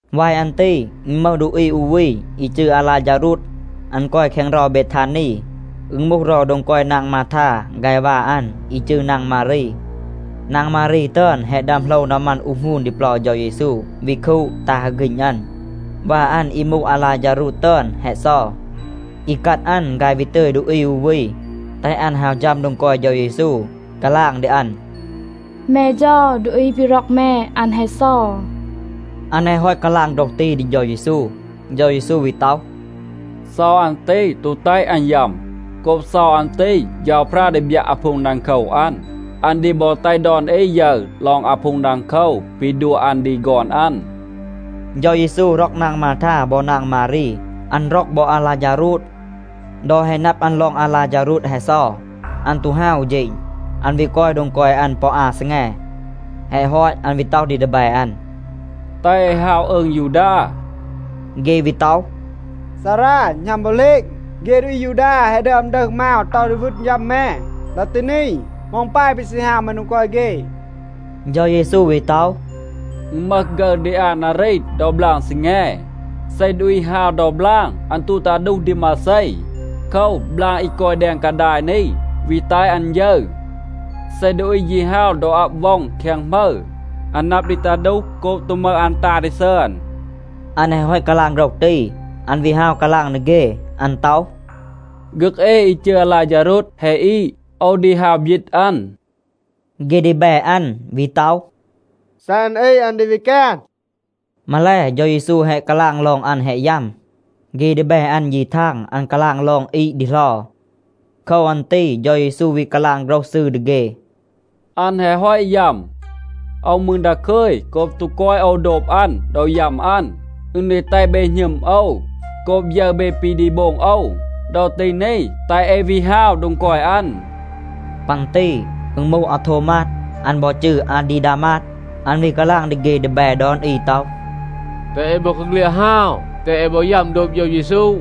วาย อัน ตี อึณ มึห ดูอี อู วี อี จืร อาลาฌารูด. อัน กอย แคง เรา เบทานี. อึณ มูห เรา โดง กอย นาง มาทา ฆาย วา อัน อี จืร นาง มารี. นาง มารี ตึอน แฮะ ดึอม โหลว นามัน อูห หงูน ดี เปลา เฌา เยซู, วี คูด, ตา ฮึก ฆีณ อัน. วา อัน อี มูห อาลาฌารูด ตึอน แฮะ เซา. อีกัด อัน ฆาย วี ตึย ดูอี อู วี, แตห อัน ฮาว ฌัม โดง กอย เฌา เยซู, กาลาง ดี อัน, “แม เฌา, ดูอี ปี ร็อก แม, อัน แฮะ เซา.” อัน แฮะ ฮอต กาลาง โฆรห ตี ดี เฌา เยซู, เฌา เยซู วี ต็อห, “เซา อัน ตี ตู แตห อัน ยัม. โกบ เซา อัน ตี, เฌาพรา ดี บยัะ อาพูง ดังโคว อัน. อัน ดี บอ แตห ดอน อี ยึร ลอง อาพูง ดังโคว ปี ดัว อัน ดี ฆอน อัน.” เฌา เยซู ร็อก นาง มาทา บอ นาง มารี. อัน ร็อก บอ อาลาฌารูด. ดอ แฮะ นับ อัน ลอง อาลาฌารูด แฮะ เซา, อัน ตู ฮาว อู เฌณ. อัน วี กอย โดง กอย อัน ปอ อา ซีแง. แฮะ ฮอต, อัน วี ต็อห ดี ดีแบ อัน, “แตห เอ ฮาว อืง ยูดา.” เฆ วี ต็อห, “ซารา, หณัม บอ เหลณ, เฆ ดูอี อายูดา แฮะ ดึอม ดึห มาว ต็อห ดี วึณ ยัม แม. ดอ ตี นี, เหมา อึณ ปาย ปี ซี ฮาว แม โดง กอย เฆ?” เฌา เยซู วี ต็อห, “อึณ มึห ฆึร ดี อา นารี ดอ บลาง ซีแง. เซ ดูอี ฮาว ดอ บลาง, อัน ตู ตา ดูห ดี มาเซ. โคว, บลาง อี กอย แดง กาดาย นี วี แตห อัน ยึร. เซ ดูอี ยี ฮาว ดอ อับ ว็อง แคง หมึร, อัน นับ ดี ตา ดูห โกบ ตู มึห อัน ตา ดี ซึอน.” อัน แฮะ ฮอต กาลาง โฆรห ตี, อัน วี ฮาว กาลาง ดี เฆ. อัน ต็อห, “ฆึก เอ อี จืร อาลาฌารูด แฮะ อีด. โอว ดี ฮาว บยีต อัน.” เฆ ดีแบ อัน วี ต็อห, “เซ อัน อีด, อัน ดี วี แกน.” มาแล เฌา เยซู แฮะ กาลาง ลอง อัน แฮะ ยัม. เฆ ดีแบ อัน, ยี ทาง, อัน กาลาง ลอง อีด ดีเหลา. โคว อัน ตี เฌา เยซู วี กาลาง โฆรห ซืร ดี เฆ, “อัน แฮะ ฮอต ยัม. โอว มืร ดาคึย, โกบ ตู กอย โอว โดบ อัน ดอ ยัม อัน. อึณ ดี แตห เบ หณึม โอว โกบ ยึร เบ ปี ดี โบง โอว. ดอ ตี นี, แตห เอ วี ฮาว โดง กอย อัน.” ปัน ตี อึณ มูห อาโทวมาด, อัน บอ จืร อาดีดามาด. อัน วี กาลาง ดี เฆ ดีแบ ดอน อี ต็อห, “แตห เอ บอกาเฆลียด ฮาว, แตห บอ เอ ยัม โดบ เฌา เยซู.”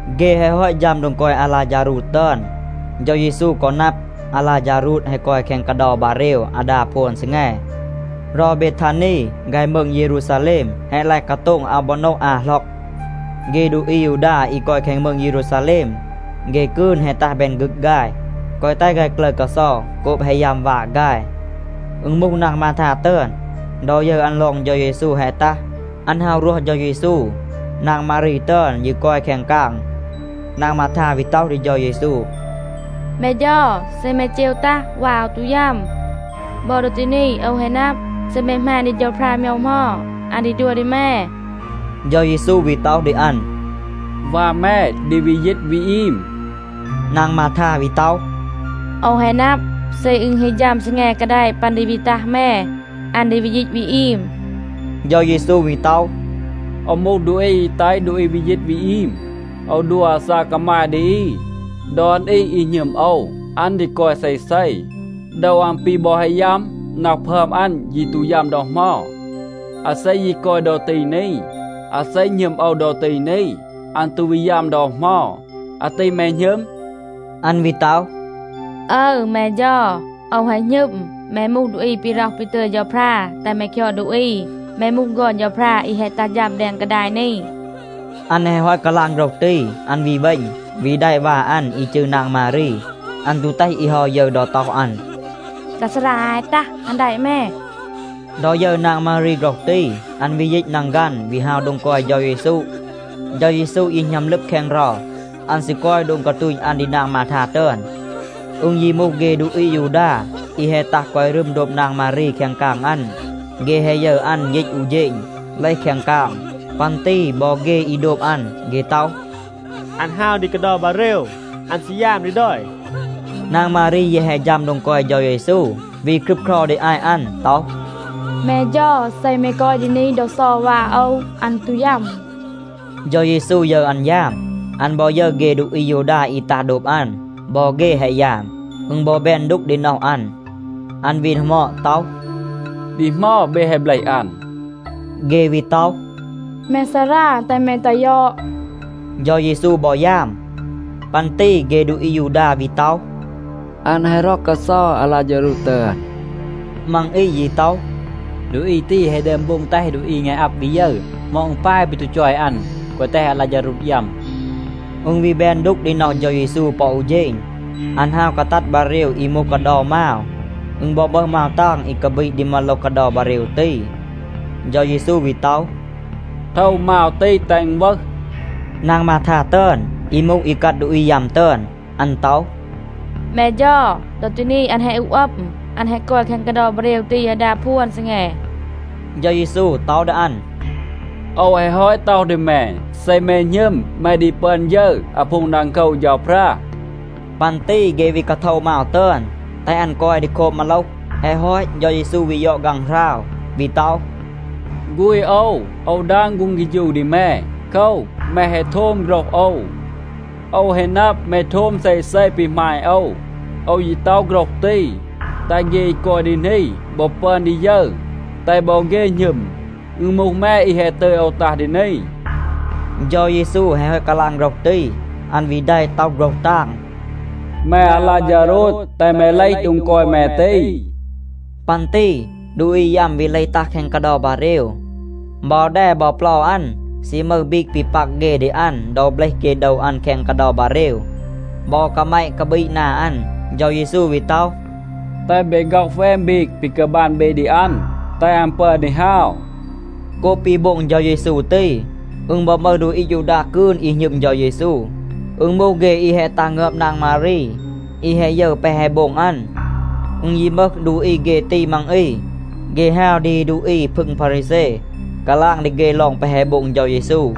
เฆ แฮะ ฮอต ฌัม โดง กอย อาลาฌารูด ตึอน, เฌา เยซู กอ นับ, อาลาฌารูด แฮะ กอย แคง กาเดา บาเรว อาดา พวน ซีแง. เรา เบทานี ฆาย มืง เยรูซาแลม แฮะ ลาย กาโต็ง อาว บอ โนะ อา หล็อก.a เฆ ดูอี อายูดา อี กอย แคง มืง เยรูซาแลม, เฆ กืน แฮะ ตัห แบน ฆึก ฆาย, แกวะ แตห ฆาย กลึร กาเซา โกบ แฮะ ยัม วา ฆาย. อึณ มูห นาง มาทา ตึอน, ดอ ยึร อัน ลอง เฌา เยซู แฮะ ตัห, อัน ฮาว รวห เฌา เยซู. นาง มารี ตึอน ยี กอย แคง กาง. นาง มาทา วี ต็อห ดี เฌา เยซู, “แม เฌา, เซ แม เจว ตัห, วา โอว ตู ยัม. บอ ดอ ตี นี โอว แฮะ นับ, เซ แม หมาณ ดี เฌาพรา โมยว เหมา, อัน ดี ดัว ดี แม.” เฌา เยซู วี ต็อห ดี อัน, “วา แม ดี วี ยีต วี อีม.” นาง มาทา วี ต็อห, “โอว แฮะ นับ, เซ อึณ ฮี ฌัม ซีแง กาแดะ ปัน ดี วี ตัห แม, อัน ดี วี ยีต วี อีม.” เฌา เยซู วี ต็อห, “โอว มูห ดูอี อี แตห ดูอี วี ยีต วี อีม. โอว ดัว อาซาก กามาย ดี อี. ดอน อี, อี หณึม โอว, อัน ดี กอย เซเซ. โดว อัน ปี บอ แฮะ ยัม, น็อห พึอม อัน ยี ตู ยัม ดอ เหมา. อาเซ ยี กอย ดอ ตี นี, อาเซ หณึม โอว ดอ ตี นี, อัน ตู วี ยัม ดอ เหมา. อาตี แม หณึม?” อัน วี ต็อห, “อึร, แม เฌา. โอว แฮะ หณึม, แม มูห ดูอี ปี ร็อห ปี ตึย เฌาพรา แตห แม คยอด ดูอี. แม มูห ฆอน เฌาพรา อี แฮะ ตัห ฌัม แดง กาดาย นี.” อัน แฮะ ฮอต กาลาง โฆรห ตี, อัน วี เวณ, วี แดะ วา อัน อี จืร นาง มารี. อัน ตู แตห อี เฮา ยึร ดอ ต็อห อัน, “ดา ซารา อาย แฮะ ตัห, อัน แดะ แม.” ดอ ยึร นาง มารี โฆรห ตี, อัน วี ยีต นังฆัน, วี ฮาว โดง กอย เฌา เยซู. เฌา เยซู ยี หณัม ลึบ แคง เรา. อัน ซี กอย โดง กาตูณ อัน ดี นาง มาทา ตึอน. อึณ ยี มูห เฆ ดูอี อายูดา อี แฮะ ตัห กอย รึม โดบ นาง มารี แคง กาง อัน, เฆ แฮะ ยึร อัน ยีต อู เฌณ, เลห แคง กาง. ปัน ตี บอ เฆ อี โดบ อัน. เฆ ต็อห, “อัน ฮาว ดี กาเดา บาเรว, อัน ซี ยาม ดี ดอย.” นาง มารี แยะ แฮะ ฌัม โดง กอย เฌา เยซู, วี ครึบเครา ดี อาต อัน ต็อห, “แม เฌา, เซ แม กอย ดี นี ดอ เซา วา โอว, อัน ตู ยัม.” เฌา เยซู ยึร อัน ยาม. อัน บอ ยึร เฆ ดูอี อายูดา อี ตัห โดบ อัน. บอ เฆ แฮะ ยาม. อึณ บอ แบน ดูก ดี น็อห อัน. อัน วี ดีหมอด ต็อห, “ดี เหมา เบ แฮะ เบลห อัน?” เฆ วี ต็อห, “แม ซารา, แตห แม ตัห ยอด.” เฌา เยซู บอ ยาม. ปัน ตี เฆ ดูอี อายูดา วี ต็อห, “อัน แฮะ ร็อก กาเซา อาลาฌารูด ตึอน.” มัง อี ยี ต็อห, “ดูอี ตี แฮะ ดึอม โบง แตห ดูอี งาย อับ วี ยึร. เหมา อึณ ปาย ปี ตู จอย อัน, แกวะ แตห อาลาฌารูด ยัม?” อึณ วี แบน ดูก ดี น็อห เฌา เยซู ปอ อู เฌณ. อัน ฮาว กาตัด บาเรว อี มูห กาเดา มาว. อึณ บอ มึห มาว ตาง อี กาบีด ดี มาโลห กาเดา บาเรว ตี. เฌา เยซู วี ต็อห, “โทว มาว ตี, แตห อึณ วึห.” นาง มาทา ตึอน อี มูห อีกัด ดูอี ยัม ตึอน, อัน ต็อห, “แม เฌา, ดอ ตี นี อัน แฮะ อูห อัม. อัน แฮะ กอย แคง กาเดา บาเรว ตี อาดา พวน ซีแง.” เฌา เยซู ต็อห ดี อัน, “โอว แฮะ ฮอต ต็อห ดี แม, เซ แม หณึม แม ดี ปึอน ยึร อาพูง ดังโคว เฌาพรา.” ปัน ตี เฆ วี กาโทวะ มาว ตึอน, แตห อัน กอย ดี โคบ มาโลห. แฮะ ฮอต, เฌา เยซู วี ยอด ฆางหราว, วี ต็อห, “ฆูณ โอว, โอว ดาง ฆูง เฆฌู ดี แม. โคว, แม แฮะ โทม โฆรห โอว. โอว แฮะ นับ, แม โทม เซเซ ปี หมาณ โอว. โอว ยี ต็อห โฆรห ตี, แตห เฆ อี กอย ดี นี บอ ปึอน ดี ยึร, แตห บอ เฆ หณึม, อึณ มูห แม, อี แฮะ ตึย โอว ตัห ดี นี.” เฌา เยซู แฮะ ฮอต กาลาง โฆรห ตี, อัน วี แดะ, ต็อห โฆรห ตาง, “แม อาลาฌารูด, แตห แม เลห โดง กอย แม ตี.” ปัน ตี ดูอี ยัม วี เลห ตัห แคง กาเดา บาเรว. บอ แด บอ เปลา อัน ซี มึห บีก ปี ปัก เฆ ดี อัน ดอ เบลห เฆ โดว อัน แคง กาเดา บาเรว. บอ กาแมะ กาบีด นา อัน. เฌา เยซู วี ต็อห, “แตห เบ ฆ็อห แวน บีก ปี กาบัน เบ ดี อัน, แตห อัน ปึอน ดี ฮาว.” โกบ ปี โบง เฌา เยซู ตี, อึณ บอ มึห ดูอี อายูดา กืน อี หณึม เฌา เยซู. อึณ มูห เฆ อี แฮะ ตัห งึอบ นาง มารี, อี แฮะ ยึร แปะ แฮะ โบง อัน. อึณ ยี มึห ดูอี เฆ ตี มัง อี, เฆ ฮาว ดี ดูอี พึง พารีแซ, กาลาง ดี เฆ ลอง แปะ แฮะ โบง เฌา เยซู.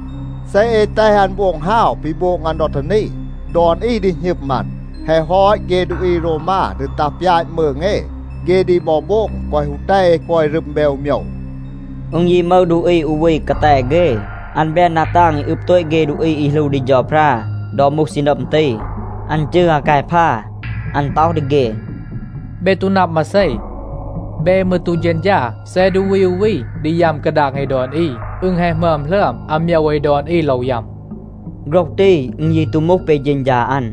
เซ เอ แตห อัน โบง ฮาว ปี โบง อัน ดอ ตี นี, ดอน อี ดี หณึม อัน. แฮะ ฮอต, เฆ ดูอี โรวมา ดี ตัห ปยาต มืง เอ. เฆ ดี บอ โบง แกวะ ฮู แตห เอ กอย รึม แบน อู โมยว.” อึณ ยี มึห ดูอี อู วี กาแต เฆ. อัน แบน ดา ตาง อี อึบ โตต เฆ ดูอี อี หลู ดี เฌาพรา ดอ มูห ซีนัม ตี. อัน จืร อากายพา. อัน ต็อห ดี เฆ, “เบ ตู นับ มาเซ. เบ มืร ตู เฌณฌา. เซ ดูอี อู วี ดี ยัม กาดาง เอ ดอน อี, อึณ แฮะ หมึอม หลึอม อาโมยว เอ ดอน อี โลว ยัม.” โฆรห ตี อึณ ยี ตู มูห ปี เฌณฌา อัน.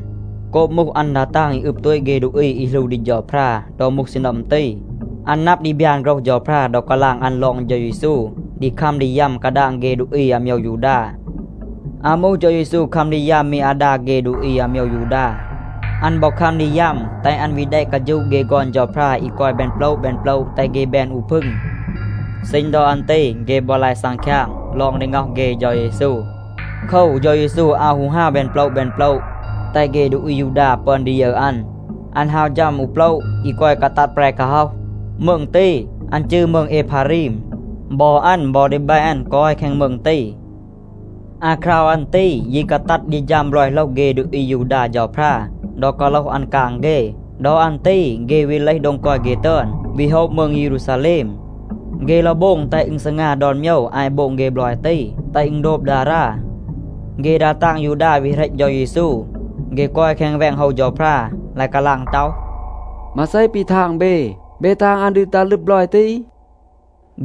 โกบ มูห อัน ดา ตาง อี อึบ โตต เฆ ดูอี อี หลู ดี เฌาพรา ดอ มูห ซีนัม ตี, อัน นับ ดี บยาน โฆรห เฌาพรา ดอ กาลาง อัน ลอง เฌา เยซู ดี คัม ดี ยัม กาดาง เฆ ดูอี อาโมยว ยูดา. อาว มูห เฌา เยซู คัม ดี ยัม มี อาดา เฆ ดูอี อาโมยว ยูดา. อัน บอ คัม ดี ยัม, แตห อัน วี แดะ กาฌูะ เฆ ฆอน เฌาพรา อี กอย แบน โปละ แบน โปละ, แตห เฆ แบน อู พึง. ซีณ ดอ อัน ตี เฆ บอ ลาย ซังคยาง ลอง ดี ง็อห เฆ เฌา เยซู. โคว, เฌา เยซู อาว ฮู ฮาว แบน โปละ แบน โปละ แตห เฆ ดูอี อายูดา ปึอน ดี ยึร อัน. อัน ฮาว ฌัม อู โปละ อี กอย กาตัด แปร กาฮ็อห. มืง ตี, อัน จืร มืง เอพารีม. บอ อัน บอ ดีแบ อัน กอย แคง มืง ตี. อาคราว อัน ตี ยี กาตัด ดี ฌัม บลอย โหลห เฆ ดูอี อายูดา เฌาพรา ดอ กาโลห อัน กาง เฆ. ดอ อัน ตี เฆ วี เลห โดง กอย เฆ ตึอน, วี โฮะ มืง เยรูซาแลม. เฆ โลว โบง แตห อึณ ซีงา ดอน โมยว อาต โบง เฆ บลอย ตี, แตห อึณ โดบ ดารา. เฆ ดา ตาง ยูดา วี เหรต เฌา เยซู. เฆ กอย แคง แวง โฮว เฌาพรา, ลาย กาลาง ต็อห, “มาเซ ปี ทาง เบ? เบ ทาง, อัน ดี ตัห ลึบ บลอย ตี?”